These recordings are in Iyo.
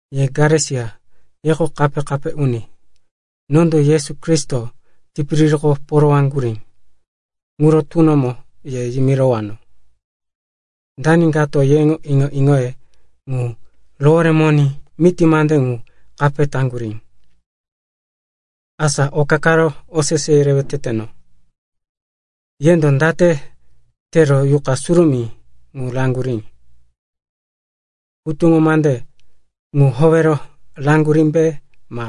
Ye Galesia, yeko kape-kape uni. Nondo Yesu Kristo tipiririko porowaŋgurí ŋuro tunomo ye yimiranowó. Dani kato yeŋo iŋo-iŋoye ŋu roworemoní miti mande ŋu kape taŋgurí? Asa oka karo osese yerewe teteno. Yendo date tero Yuqa Surumí ŋu raŋgurí? Hutuŋo mande ŋu howero raŋgurímbe ma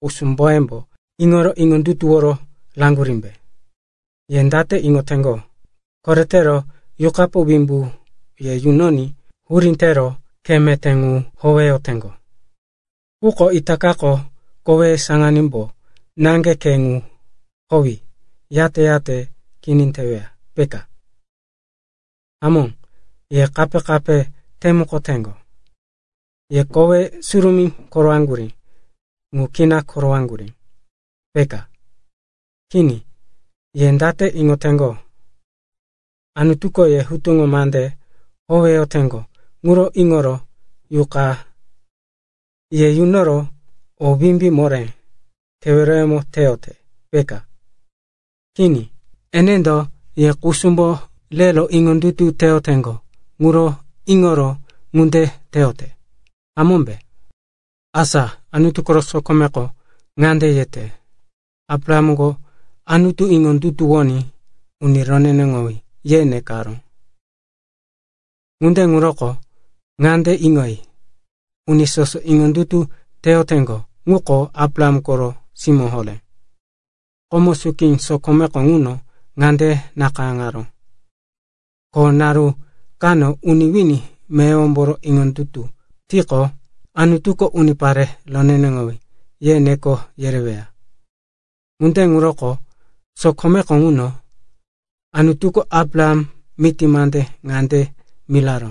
kusumboyembo iŋoro iŋondutuworo raŋgurímbe? Ye date iŋoteŋgo, koretero Yuqapo wimbu ye yunoní hurí tero khe meté ŋu howeyoteŋgo, quko itakako koweye saŋanímbo naŋge khe ŋu howi, yate-yate kini teweya, peka? Hamó, ye kape-kape temukoteŋgo. Ye kowe surumí korowaŋgurí ŋu kina korowaŋgurí, peka? Kini. Ye date iŋoteŋgo? Anutuko ye hutuŋo mande howeyoteŋgo ŋuro iŋoro Yuqa ye yunoro o wimbí moré keweroyemo teyote, peka? Kini, enendo ye kusumbo rero iŋondutu teyoteŋgo ŋuro iŋoro ŋunde teyote, hamómbe? Asa Anutu koro sokomeko ŋande yete, “Abrahamko Anutu iŋondutuwoní, uni roneneŋowí, ye nekaró.” Ŋunde ŋuroko ŋande iŋoyi, uni soso iŋondutu teyoteŋgo ŋuko Abraham koro simó horé. Komo suki sokomeko ŋuno ŋande nakayáŋaró, ko naru kano uni wini meyowombo iŋondutu tiqo, Anutuko, unipare roneneŋowí, ye neko yereweya. Ŋunde ŋuroko sokomeko ŋuno Anutuko Abraham miti mande ŋande miraró,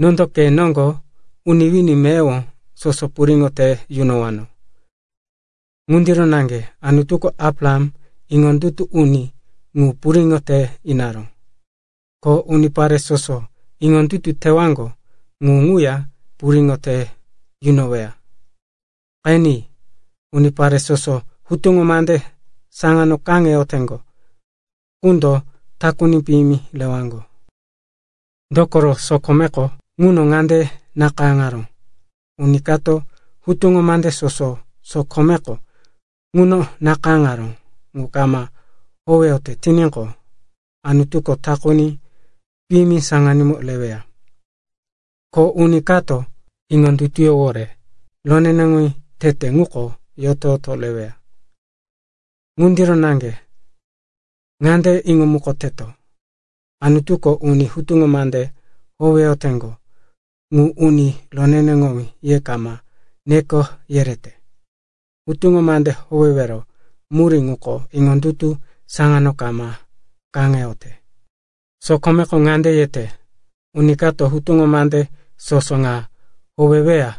“Nondo ke noŋgo uni wini meyowo soso puriŋo te yunowano.” Ŋundiro naŋge Anutuko Abraham, iŋondutu uni ŋu, puriŋo te inaró, ko unipare soso iŋondutu tewaŋgo ŋu ŋuya puriŋo te yunoweya. Qeni, unipare soso hutuŋo mande saŋano kaŋeyoteŋgo ŋundo takuni piyimi rewaŋgo. Dokoro sokomeko ŋuno ŋande nakayáŋaró, “Uni kato hutuŋo mande soso sokomeko ŋuno nakayáŋaró ŋu kama howeyote tiníqo, Anutuko takuni piyimi saŋanímo reweya.” Ko, “Uni ka iŋondutuyówore roneneŋowí tete ŋuko yoto-yoto reweya.” Ŋundiro naŋge ŋande iŋomukoteto, Anutuko uni hutuŋo mande howeyoteŋgo ŋu uni roneneŋowí ye kama neko yerete. Hutuŋo mande howewero murí ŋuko iŋondutu saŋano kama kaŋeyote. Sokomeko ŋande yete, “Uni kato hutuŋo mande soso ŋa howeweya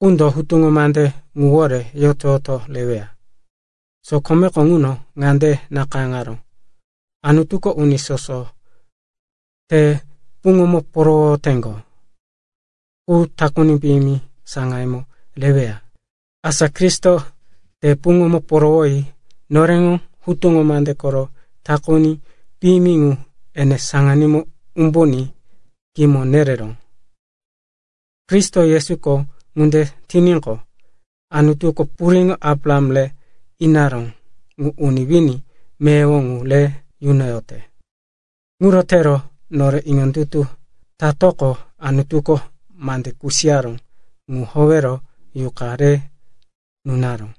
qundo hutuŋo mande ŋuwore yoto-yoto reweya.” Sokomeko ŋuno ŋande nakayáŋaró, “Anutuko uni soso te puŋomo porowoteŋgo qu takuni piyimi saŋayemo reweya.” Asa Kristo te puŋomo porowoyi noreŋo hutuŋo mande koro takuni piyimi ŋu ene saŋanímo umbuní kimo nereró. Kristo Yesuko ŋunde tiníqo, Anutuko puriŋo Abraham re inaró ŋu uni wini meyowo ŋu re yunoyote. Ŋuro tero nore iŋondutu tatoqo, Anutuko mande kusiyaró ŋu howero Yuqa re nunaró.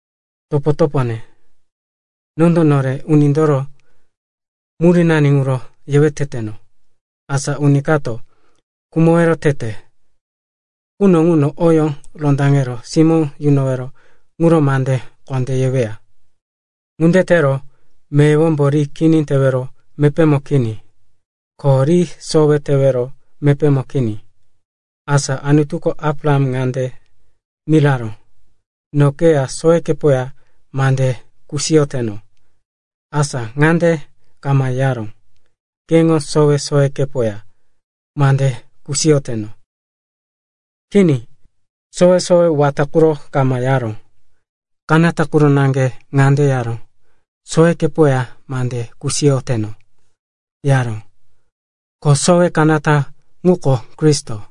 Topo-topone, nondo nore unindoro murínani ŋuro yewe teteno. Asa uni kato khumowero tete quno ŋuno oyó rondaŋero simó yunowero ŋuro mande kondé yeweya. Ŋunde tero meyowombo ri kini tewero mepémo kini, ko ri sowe tewero mepémo kini. Asa Anutuko Abraham ŋande miraró, “No keya sowekepoya mande kusiyoteno.” Asa ŋande kama yaró, “Keŋo sowe-sowekepoya mande kusiyoteno.” Kini, sowe-sowe wata ŋuro kama yaró. Kanata quro naŋge ŋande yaró, “Sowekepoya mande kusiyoteno,” yaró. Ko sowe kanata ŋuko Kristo.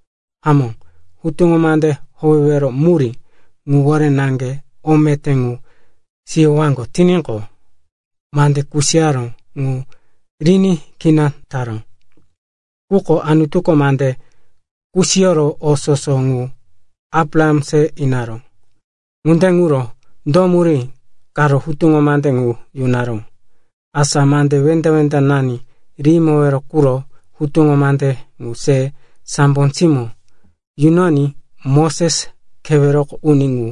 Hamó, hutuŋo mande howewero murí ŋuwore naŋge o meté ŋu siyowaŋgo tiníqo, mande kusiyaró ŋu riní kini taró. Quko Anutuko mande kusiyoro o soso ŋu Abraham se inaró. Ŋunde ŋuro, do murí karo hutuŋo mande ŋu yunaró? Asa mande wenda-wendanani rihimowero quro hutuŋo mande ŋu se sambo simó yunoní Moses, keweroko uni ŋu,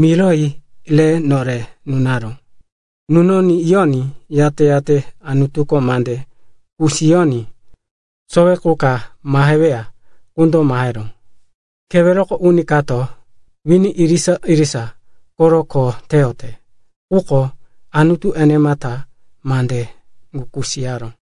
miroyi re nore nunaró. Nunoní yoní, yate-yate Anutuko mande kusiyoní sowe qu ka maheweya ŋundo maheró. Keweroko uni kato wini irisa-irisa koro kho teyote. Quko Anutu enemata mande ŋu kusiyaró.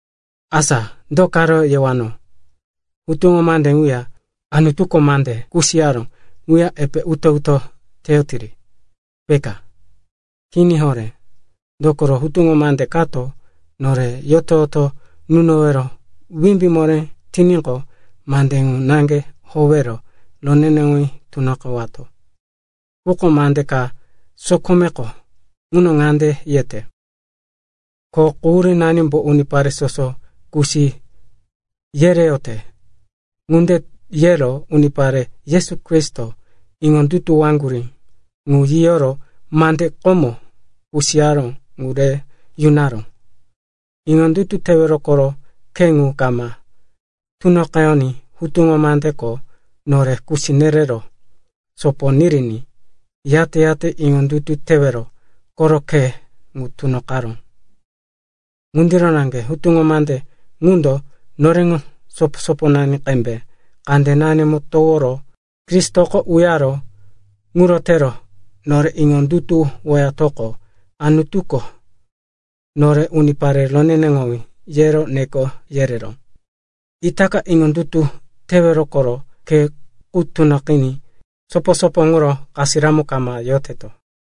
Asa do ka yewano? Hutuŋo mande ŋuya Anutuko mande kusiyaró ŋuya epe uto-uto teyotiri, peka? Kini horé. Dokoro hutuŋo mande kato nore yoto-yoto yunowero wimbí moré tiníqo, mande ŋu naŋge howero roneneŋowí tunoqewato. Quko mande ka sokomeko ŋuno ŋande yete, ko quhurímbo unipare soso kusi yereyote. Ŋunde yero unipare Yesu Kristo iŋondutuwowaŋgo ŋu yiyoro mande komo kusiyaró ŋu re yunaró. Iŋondutu tewero koro khe ŋu kama tunoqeyoní hutuŋo mandeko nore kusi nerero sopo niriní, yate-yate iŋondutu tewero koro khe ŋu tunoqaró. Ŋundiro naŋge hutuŋo mande ŋundo noreŋo sopo-soponani qembe kandenanimo toworo Kristoko uyaró. Ŋuro tero nore iŋondutuwoyatoqo, Anutuko nore, unipare roneneŋowí, yero neko yereró. Itaka iŋondutu tewero koro khe ŋu tunoqiní sopo-sopo ŋuro kasiramo kama yoteto.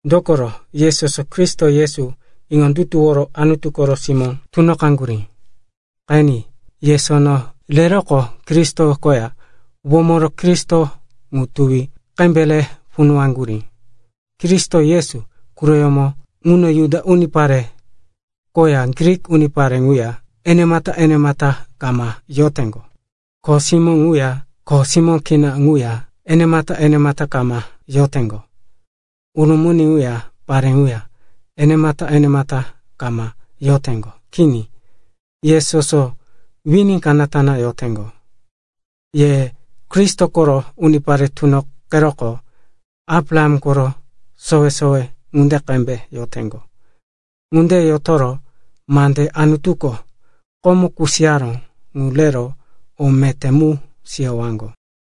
Dokoro ye soso Kristo Yesu iŋondutuworo Anutu koro simó tunoqaŋgurí. Qeni, ye sono reroqo Kristo koya womoro Kristo ŋu tuwi qembe re punuwaŋgurí. Kristo Yesu quroyómo ŋuno Juda unipare ŋuya Grik unipare ŋuya enemata-enemata kama yoteŋgo; kho simó ŋuya kho simó kini quya enemata-enemata kama yoteŋgo; urumuni ŋuya pare ŋuya enemata-enemata kama yoteŋgo. Kini, ye soso wini kanata yoteŋgo. Ye Kristo koro unipare tunoqeroqo Abraham koro sowe-sowe ŋunde qembe yoteŋgo. Ŋunde yotoro mande Anutuko komo kusiyaró ŋu rero o meté mu siyowaŋgo.